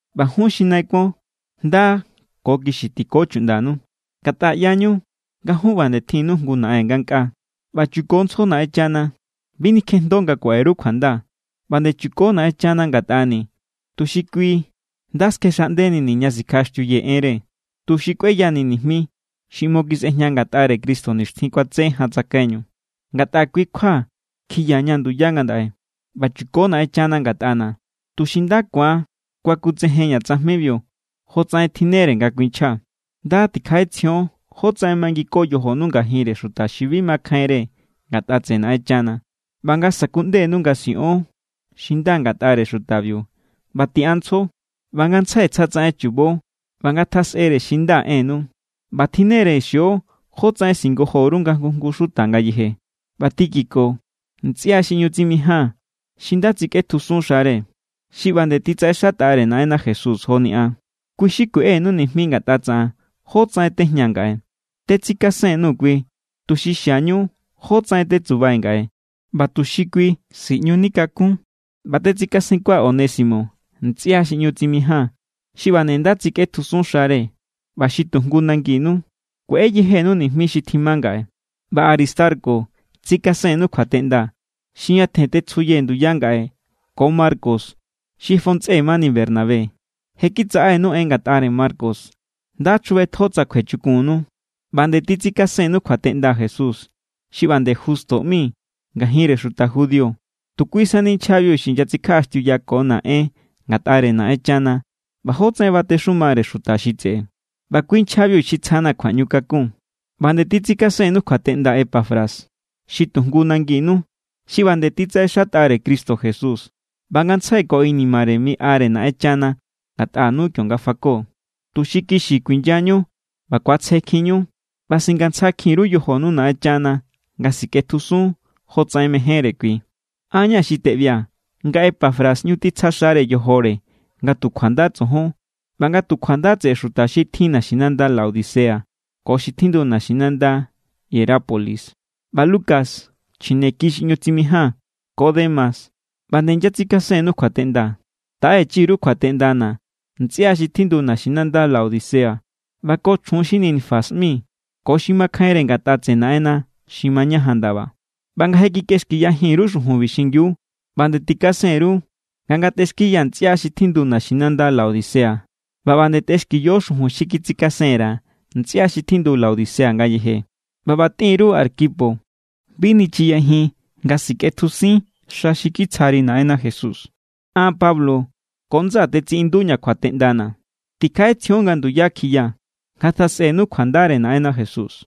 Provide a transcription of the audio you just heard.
ꞌBa jun xi nai kuon, nda ko kixi tiko chuꞌndanu. Ngatꞌa ꞌyañu nga jun ꞌba nde tjinnu jngu Naꞌen ngankꞌaa. ꞌBa chukontsjo Naꞌenchana. Bi nikjejndo nga kuaꞌe_ru kjuanda. ꞌBa nde chuko Naꞌenchana ngatꞌani̱ tuxi kui nda skjexꞌandenini̱ ña sikjaꞌaxtiuyee̱ enre, tuxi kꞌueyanii̱ nijmi xi ꞌmo kisꞌejña ngatꞌare Cristo nixtjin kuatse jan tsakaiñu. Ngatꞌa kui= kjua kjiyaña̱ nduya ngandaꞌe. ꞌBa chuko Naꞌenchana ngatꞌana̱ tuxi nda ku̱an kuakutsejenña̱ tsajmibiu, jotsaꞌen tjinnere nga kuinchjaa̱. Nda tikjaꞌetsjion jótsaꞌen mangiko yojonu ngajinre xuta xi bi makjainre ngatꞌa tseꞌe Naꞌenchana, ꞌba nga sa̱kuꞌndenu nga siꞌon xi nda ngatꞌare xutabiu, ꞌba tiꞌanntsjo. ꞌBa ngantsjai tsja tsaꞌen chubo ꞌba ngatjasꞌere xi nda ennu, ꞌba tjinne=re xio jótsaꞌen singojo_ru nga jngu jngu xuta ngayeje. ꞌBa Tíquico, ntsꞌia xi ꞌñu tsimijaa̱n xi nda tsikꞌetjusun xare, xi ꞌba nde titsaꞌexatꞌare Naꞌenna Jesús joni an, kui xi kueꞌenu nijmi ngatꞌa tsaꞌan jótsaꞌen tejñaa̱ ngaꞌe. Tetsikasenkun_nuu̱ kui tuxi xiañu jótsaꞌen tetsubai̱ ngaꞌe, ꞌba tuxi kui siꞌñuni̱ kakun. ꞌBa tetsikasenkua̱ Onésimo, ntsꞌia xi ꞌñu tsimijaa̱n xi ꞌba nde nda tsikꞌetjusun xare ꞌba xi tu jngu nanginu. Kueꞌe yejenu nijmi xi tjima ngaꞌe. ꞌBa Aristarco tsikasennu kjuateꞌnda, xi ñatjen tetsjuyee̱ nduya ngaꞌe, ko Marcos xi fontsꞌe mani Bernabé. Je kitsaꞌenu en ngatꞌare Marcos. Nda chjubetjo tsa kjuechukunnu. ꞌBa nde titsikasennu kjuateꞌnda Jesús xi ꞌba nde Justo ꞌmi. Ngajinre xuta judío tu kui sani nchjabiu xi inyatsikjaꞌaxtiuyakona̱ en ngatꞌare Naꞌenchana ꞌba jótsaꞌen batexumare xuta xi tseꞌe. ꞌBa kui nchjabiu xi tsjana̱ kjuaꞌñu kakun. ꞌBa nde titsikasennu kjuateꞌnda Epafras, xi tu jngu nanginu. Xi ꞌba nde titsaꞌexatꞌare Cristo Jesús ꞌba ngantsjai ko inimare miꞌare Naꞌenchana ngatꞌanu kionga fako, tuxi kixi kuinyañu ꞌba ku̱atsjekjinniñu ꞌba singantsjakjinni_ru yojonu Naꞌenchana nga sikꞌetjusun jotsaꞌen mejénre kui. An= ña̱ xi teꞌbia̱ nga Epafras ꞌñu titsja xare yojore nga tu kjuanda tsojon ꞌba nga tu kjuanda tseꞌe xuta xi tjindu naxinanda Laodicea ko xi tjindu naxinanda Hierápolis. ꞌBa Lucas, chjineki xi ꞌñu tsimijaa̱n, ko Demas ꞌba nde inyatsikasennu kjuateꞌnda. Taꞌechi_ru kjuateꞌndana̱ ntsꞌia xi tjindu naxinanda Laodicea ꞌba ko chjun xi Ninfas ꞌmi ko xi makjainre ngatꞌa tseꞌe Naꞌenna xi mañajan ndaba. ꞌBa nga je kikꞌexkiyajin_ru xujunbi xingiu, ꞌba nde tikasen_ru nga ngatꞌexkiya ntsꞌia xi tjindu naxinanda Laodicea. ꞌBa ꞌba nde tꞌexkiyo xujun xi kitsikasen_ra̱ ntsꞌia xi tjindu Laodicea ngayeje. ꞌBa ꞌba tꞌin_ru Arquipo: “Bi nichiyajin nga sikꞌetjusin xa xi kitsjari Naꞌenna Jesús.” An Pablo ko ndsaa̱ tetsiꞌinduña̱ kjuateꞌndana̱. Tikjaꞌetsjion nga nduya kjiya. Ngatjasꞌenu kjuandare Naꞌenna Jesús.